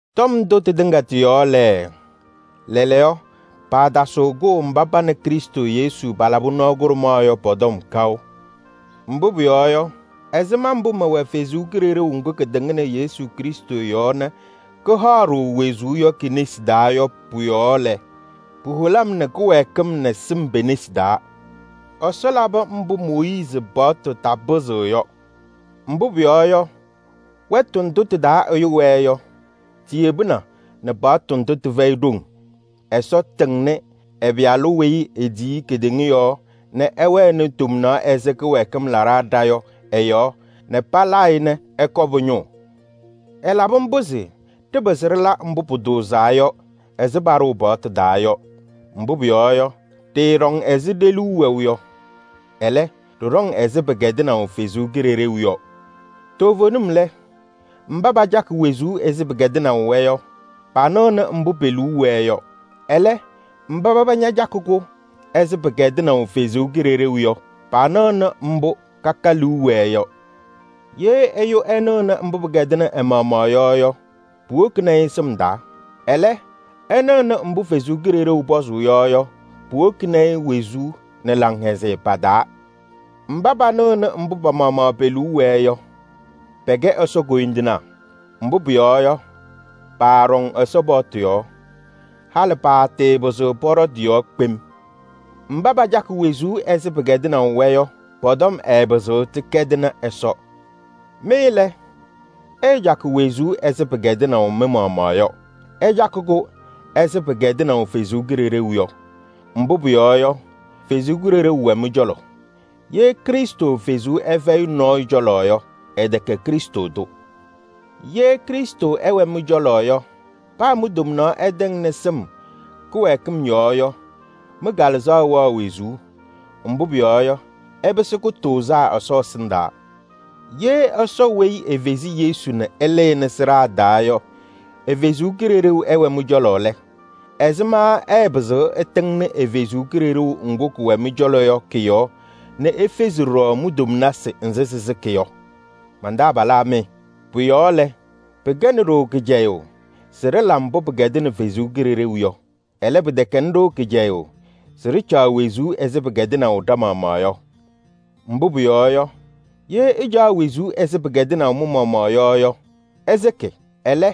Tɔm ndʋ tɩtɩŋa tɩ-yɔɔ lɛ, lɛɛlɛɛyɔ paatasɩɣ kʋʋ mba pa nɛ Krɩstʋ Yesu palabɩ nɔɔ kʋɖʋmaɣ yɔ pɔ-tɔm kaʋ. Mbʋ pʋyɔɔ yɔ, ɛzɩma mbʋ mɛwɛ Ɛsɔ Kalɩzaɣ ŋga katɩŋnɩ Krɩstʋ Yesʋ yɔɔ nɛ kahaɣ-ɖʋ wezuu yɔ ke-nesi taa yɔ pʋ-yɔɔ lɛ, puholi-m nɛ kɩwɛɛkɩm nɛ sɩm pe-nesi taa. Ɛsɔ labɩ mbʋ Mooyiizi paɣtʋ tapɩzɩɣ yɔ. Mbʋ pʋyɔɔ yɔ, wɛtʋ ndʋ tɩ-taa ɛyʋ wɛɛ yɔ, tiyebina nɛ paɣtʋ ndʋ tɩfɛyɩ ɖoŋ: Ɛsɔ tɩŋnɩ ɛ-Pɩyalʋ weyi etiyi kedeŋa yɔɔ nɛ ɛwɛnɩ tomnaɣ ɛzɩ kɩwɛɛkɩm laɖaa ɖa yɔ ɛ-yɔɔ nɛ palaa-ɩ nɛ ɛkɔ pʋ-ñʋʋ. Ɛlabɩ mbʋ se ɖɩpɩzɩ ɖɩla mbʋ pʋtʋʋzaa yɔ ɛzɩ paɖʋʋ paɣtʋ taa yɔ. Mbʋ pʋyɔɔ yɔ, ɖɩɩɖɔŋ ɛzɩ ɖe-liu wɛʋ yɔ. Ɛlɛ, ɖɩɖɔŋ ɛzɩ pɩkɛdɩnaʋ Ɛsɔ Kalɩzaɣ yɔ. Toovenim lɛ, mba pacakɩ wezuu ɛzɩ pɩkɛdɩnaʋ-wɛ yɔ, panɩɣnɩ mbʋ pe-liu wɛɛ yɔ. Ɛlɛ, mba paba ñacakɩ-kʋ ɛzɩ pɩkɛdɩnaʋ Ɛsɔ Kalɩzaɣ yɔ, panɩɣnɩ mbʋ kaka liu wɛɛ yɔ. Ɛyʋ nɩɣʋnɩ mbʋ pɩkɛdɩnɩ ɛ-maɣmaɣ yɔ, puwokini-i sɩm taa. Ɛlɛ, ɛnɩɣʋnɩ mbʋ Ɛsɔ Kalɩzaɣ pɔzʋʋ yɔ, puwokini-i wezuu nɛ laŋhɛzɩyɛ pa-taa. Mba panɩɣnɩ mbʋ pa-maɣmaɣ pe-liu wɛɛ yɔ, pɛkɛ Ɛsɔ koyindinaa. Mbʋ pʋyɔɔ yɔ, paaɖɔŋ Ɛsɔ paɣtʋ yɔɔ. Halɩ paatɩɩpɩzɩɣ pɔɖɔ tɩ-yɔɔ kpem. Mba pacakɩ wezuu ɛzɩ pɩkɛdɩnaʋ-wɛ yɔ, pɔ-tɔm ɛɛpɩzɩɣ tɩkɛdɩnɩ Ɛsɔ. Mɩ lɛ, ɩɩcakɩ wezuu ɛzɩ pɩkɛdɩnaʋ mɩ-maɣmaɣ yɔ, ɩcakɩ-kʋ ɛzɩ pɩkɛdɩnaʋ Ɛsɔ Kalɩzaɣ yɔ. Mbʋ pʋyɔɔ yɔ, Ɛsɔ Kalɩzaɣ wɛ mɩ-cɔlɔ. Ye Krɩstʋ Kalɩzaɣ ɛfɛyɩ nɔɔyʋ cɔlɔ yɔ, ɛtɛkɛ Krɩstʋ tʋ. Ye Krɩstʋ ɛwɛ mɩ-cɔlɔ yɔ, paa mi-tomnaɣ ɛtɛŋnɩ sɩm kɩwɛɛkɩm yɔɔ yɔ, mɩ-kalɩzaɣ wɛɣ wezuu. Mbʋ pʋyɔɔ yɔ, ɩpɩsɩ kʋtʋʋzaa Ɛsɔ ɛsɩndaa. Ye Ɛsɔ weyi efezi Yesu nɛ ɛlɩnɩ sɩɖaa taa yɔ ɛ-Kalɩzaɣ ɛwɛ mɩ-cɔlɔ lɛ, ɛzɩma ɛɛpɩzɩɣ ɛtɩŋnɩ ɛ-Kalɩzaɣ ŋga kɛwɛ mɩ-cɔlɔ yɔ kɔ-yɔɔ nɛ efezi ɖɔɖɔ mi-tomnasɩ nzɩ sɩsɩkɩ yɔ? Man-taabalaa mɩ, pʋ-yɔɔ lɛ, pɩkɛnɩ-ɖʋ kɩcɛyʋʋ se ɖɩla mbʋ pɩkɛdɩnɩ Ɛsɔ Kalɩzaɣ yɔ. Ɛlɛ, pɩtɛkɛnɩ-ɖʋ kɩcɛyʋʋ se ɖɩcaɣ wezuu ɛzɩ pɩkɛdɩnaʋ ɖa-maɣmaɣ yɔ. Mbʋ pʋyɔɔ yɔ, ye ɩcaɣ wezuu ɛzɩ pɩkɛdɩnaʋ mɩ-maɣmaɣ yɔ yɔ, ɩsɩkɩ. Ɛlɛ,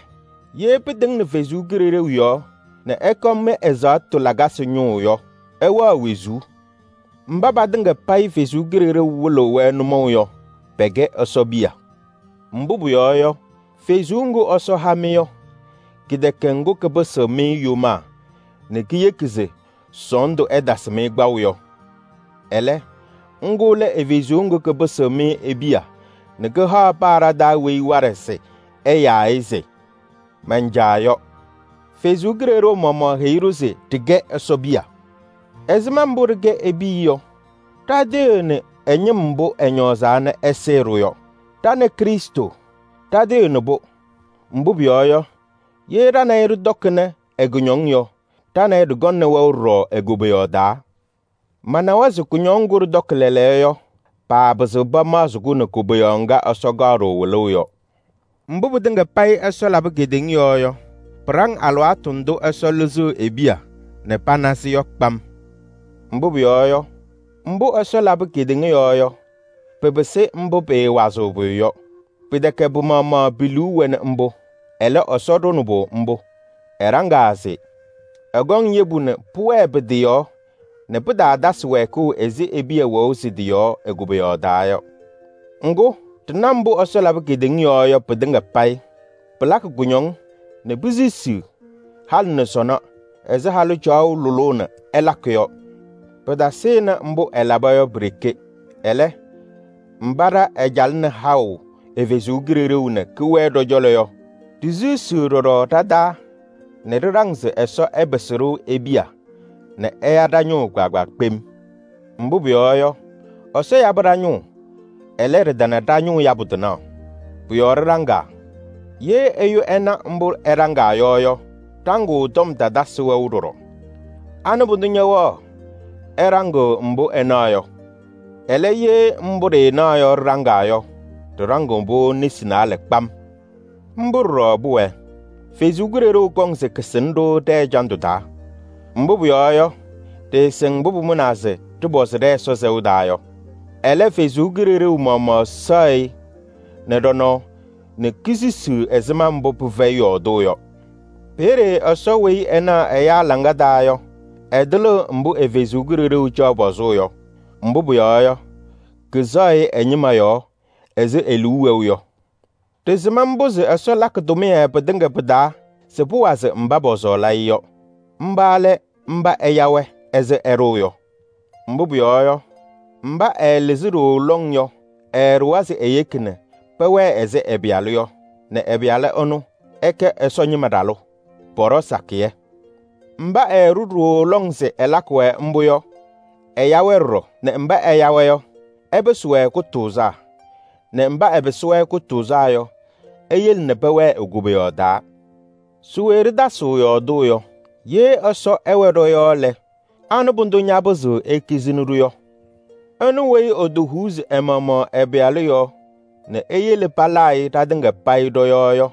ye pɩtɩŋnɩ Ɛsɔ Kalɩzaɣ yɔɔ nɛ ɩkɔ mɩ-ɛzaɣtʋ lakasɩ ñʋʋ yɔ, ɩwɛɣ wezuu. Mba patɩŋa payɩ Ɛsɔ Kalɩzaɣ wɩlɩɣ-wɛ nʋmɔʋ yɔ, pɛkɛ Ɛsɔ piya. Mbʋ pʋyɔɔ yɔ, Kalɩzaɣ ŋga Ɛsɔ ha-mɩ yɔ, kɛtɛkɛ ŋga kapɩsɩɣ-mɩ yomaa nɛ keyeki se sɔɔndʋ ɛtasɩ-mɩ kpaʋ yɔ. Ɛlɛ, ŋga lɛ ɛ-Kalɩzaɣ ŋga kapɩsɩɣ-mɩ e-piya nɛ kaha paa ɖa-taa weyi waɖɛ se ɛyaa-ɩ se: “Man-Caa!” yɔ. Ɛsɔ Kalɩzaɣ maɣmaɣ heyi ɖa-ñɩŋga se ɖɩkɛ e-piya. Ɛzɩma mbʋ ɖɩkɛ e-piya yɔ, ɖatɩɣyɩɣnɩ ɛ-ñɩm mbʋ ɛñɔɔzaa nɛ ɛsɩɩ-ɖʋ yɔ. Ɖa nɛ Krɩstʋ ɖɩtɩɣyɩɣnɩ-pʋ. Mbʋ pʋyɔɔ yɔ, ye ɖa nɛ ɩ ɖɩtɔkɩnɩ ɛ-kʋñɔŋ yɔ, ɖa nɛ ɩ ɖɩkɔŋnɩ wɛʋ ɖɔɖɔ e-koboyaɣ taa. Manawa se kʋñɔŋ ŋgʋ ɖɩtɔkɩ lɛɛlɛɛyɔ yɔ, paapɩzɩɣ pamaɣzɩnɩ-kʋ nɛ koboyaɣ ŋga Ɛsɔ kaɣ-ɖʋ wɩlʋʋ yɔ. Mbʋ pɩtɩŋa payɩ Ɛsɔ labɩ kedeŋa yɔɔ yɔ, pɩɖaŋ alɩwaatʋ ndʋ Ɛsɔ lɩzɩɣ e-piya nɛ pana-sɩ yɔ kpam. Mbʋ pʋyɔɔ yɔ, mbʋ Ɛsɔ labɩ kedeŋa yɔɔ yɔ, pɩpɩsɩ mbʋ pɩɩwazɩɣ pʋyʋ yɔ. Pɩtɛkɛ pɩ-maɣmaɣ pi-liu wɛnɩ mbʋ, ɛlɛ, Ɛsɔ ɖʋnɩ-pʋ mbʋ. Ɛɖaŋaa se: ɛkɔŋ yebu nɛ pʋwɛɛ pɩ-tɩ yɔɔ nɛ pɩtaatasɩ wɛɛkʋʋ ɛzɩ e-piya wɛʋ sɩ-tɩ yɔɔ e-koboyaɣ taa yɔ. Ŋgʋ, ɖɩna mbʋ Ɛsɔ labɩ kedeŋa yɔɔ yɔ pɩtɩŋa payɩ, pɩlakɩ kʋñɔŋ nɛ pisisiɣ halɩ nɛ sɔnɔ ɛzɩ halʋ caɣʋ lʋlʋʋ nɛ ɛlakɩ yɔ. Pɩtasɩnɩ mbʋ ɛlaba yɔ pi-ɖeke. Ɛlɛ, mba ɖa ɛcalɩnɩ haʋ ɛ-Kalɩzaɣ nɛ kɛwɛɛ ɖɔ-cɔlɔ yɔ, ɖisisiɣ ɖɔɖɔ ɖa-taa nɛ ɖɩɖaŋ se Ɛsɔ ɛpɩsɩ-ɖʋ e-piya nɛ ɛya ɖa-ñʋʋ kpaagbaa kpem. Mbʋ pʋyɔɔ yɔ, Ɛsɔ yabɩ ɖa-ñʋʋ, ɛlɛ, ɖɩtana ɖa-ñʋʋ yabʋ tɩnaɣ. Pʋ-yɔɔ ɖɩɖaŋaa. Ye ɛyʋ ɛna mbʋ ɛɖaŋaa yɔ yɔ, ɖaŋʋʋ tɔm tatasɩ wɛʋ ɖɔɖɔ: anɩ pʋdʋ ñɛwɛɣ ɛɖaŋɩɣ mbʋ ɛnaɣ yɔ? Ɛlɛ, ye mbʋ ɖɩɩnaɣ yɔ ɖɩɖaŋaa yɔ, ɖɩɖaŋɩɣ-pʋ nesi naalɛ kpam. Mbʋ ɖɔɖɔ pʋwɛɛ, Ɛsɔ Kalɩzaɣ kɔŋ se kasɩnɩ-ɖʋ ɖɛ-ɛjandʋ taa. Mbʋ pʋyɔɔ yɔ, ɖɩɩsɩŋ mbʋ pʋmʋnaa se ɖɩpɔzɩ ɖɛ-Ɛsɔ sɛʋ taa yɔ. Ɛlɛ, Ɛsɔ Kalɩzaɣ maɣmaɣ sɛɣ-ɩ nɛ ɖɔ-nɔɔ nɛ kesisiɣ ɛzɩma mbʋ pɩfɛyɩ yɔɔdʋʋ yɔ. Peeye Ɛsɔ weyi ɛnaɣ ɛyaa hɔ taa yɔ, ɛtɩlɩɣ mbʋ ɛ-Kalɩzaɣ caɣ pɔzʋʋ yɔ. Mbʋ pʋyɔɔ yɔ, kɛsɛɣ-ɩ ɛ-ñɩma yɔɔ ɛzɩ e-liu wɛʋ yɔ. Ɖɩsɩm mbʋ se Ɛsɔ lakɩ tʋmɩyɛ pɩtɩŋa pɩ-taa se pʋwazɩ mba pɔsɔɔlɩ-ɩ yɔ. Mba lɛ mba ɛya-wɛ ɛzɩ ɛɖʋʋ yɔ. Mbʋ pʋyɔɔ yɔ, mba ɛɛlɩzɩ ɖooo lɔŋ yɔ ɛɛɖʋwa se eyeki nɛ pɛwɛɛ ɛzɩ ɛ-Pɩyalʋ yɔ, nɛ ɛ-Pɩyalʋ ɛnʋ, ɛkɛ Ɛsɔ ñɩma ɖalʋ. Pɔɖɔ sakɩyɛ. Mba ɛɛɖʋ ɖooo lɔŋ se ɛlakɩ-wɛ mbʋ yɔ, ɛya-wɛ ɖɔɖɔ, nɛ mba ɛya-wɛ yɔ, ɛpɩsɩ-wɛ kʋtʋʋzaa, nɛ mba ɛpɩsɩ-wɛ kʋtʋʋzaa yɔ, eyele nɛ pɛwɛɛ e-Koboyaɣ taa. Se we ɖɩtasɩɣ yɔɔdʋʋ yɔ? Ye Ɛsɔ ɛwɛ ɖɔ-yɔɔ lɛ, anɩ pʋdʋ ñapɩzɩɣ ekizini-ɖʋ yɔ? Ɛnʋ weyi ɛtɛfɛɛ ɛ-maɣmaɣ ɛ-Pɩyalʋ nɛ eyele palaa-ɩ ɖatɩŋa payɩ ɖɔ-yɔɔ yɔ,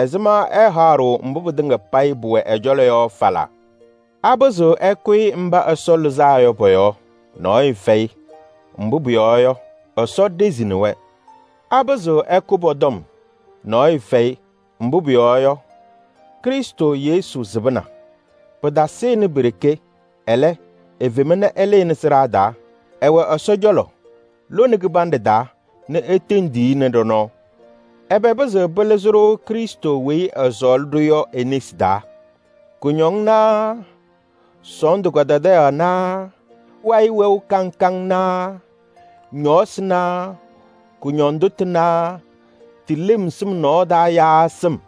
ɛzɩma ɛɛhaɣ-ɖʋ mbʋ pɩtɩŋa payɩ pʋwɛ ɛ-cɔlɔ yɔ falaa? Apɩzɩɣ ɛkʋyɩ mba Ɛsɔ lɩzaa yɔ pɔ-yɔɔ? Nɔɔyʋ fɛyɩ, mbʋ pʋyɔɔ yɔ, Ɛsɔ ɖezini-wɛ. Apɩzɩɣ ɛkʋ pɔ-tɔm? Nɔɔyʋ fɛyɩ, mbʋ pʋyɔɔ yɔ, Krɩstʋ Yesu sɩbɩna. Pɩtasɩnɩ pi-ɖeke, ɛlɛ, efema nɛ ɛlɩnɩ sɩɖaa taa. Ɛwɛ Ɛsɔ cɔlɔ lone kɩbanɖɛ taa nɛ etendiɣ-i nɛ ɖɔ-nɔɔ. Ɛbɛ pɩzɩɣ pɩlɩzɩ-ɖʋ Krɩstʋ weyi ɛsɔɔlɩ-ɖʋ yɔ e-nesi taa? Kʋñɔŋ naa sɔɔndʋ kadadaɣyaɣ naa wayɩ wɛʋ kaŋ kaŋ naa ñɔɔsɩ naa kʋñɔndʋ tʋ naa tɩ lem sɩm nɔɔ taa yaa sɩm?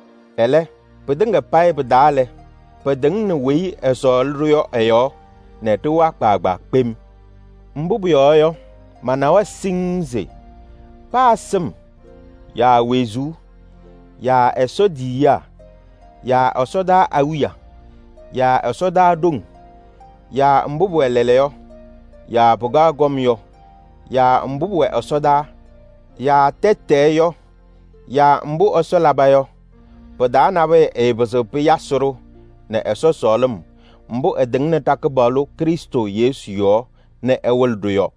Ɛlɛ, pɩtɩŋa payɩ pɩ-taa lɛ, pɩtɩŋnɩ weyi ɛsɔɔlɩ-ɖʋ yɔ ɛ-yɔɔ nɛ ɖɩwa kpaagbaa kpem. Mbʋ pʋyɔɔ yɔ, manawa siŋŋ se: paa sɩm yaa wezuu yaa Ɛsɔ tiyiyaa yaa ɛsɔdaa awiya yaa ɛsɔdaa ɖoŋ yaa mbʋ pʋwɛ lɛɛlɛɛyɔ yaa pɩkaɣ kɔm yɔ yaa mbʋ pʋwɛ ɛsɔdaa yaa tɛtɛɛ yɔ yaa mbʋ Ɛsɔ laba yɔ pɩ-taa nabʋyʋ ɛɛpɩzɩɣ pɩyasɩ-ɖʋ nɛ Ɛsɔ sɔɔlɩm mbʋ ɛtɩŋnɩ ɖa-Kɩpaɣlʋ Krɩstʋ Yesu yɔɔ nɛ ɛwɩlɩ-ɖʋ yɔ.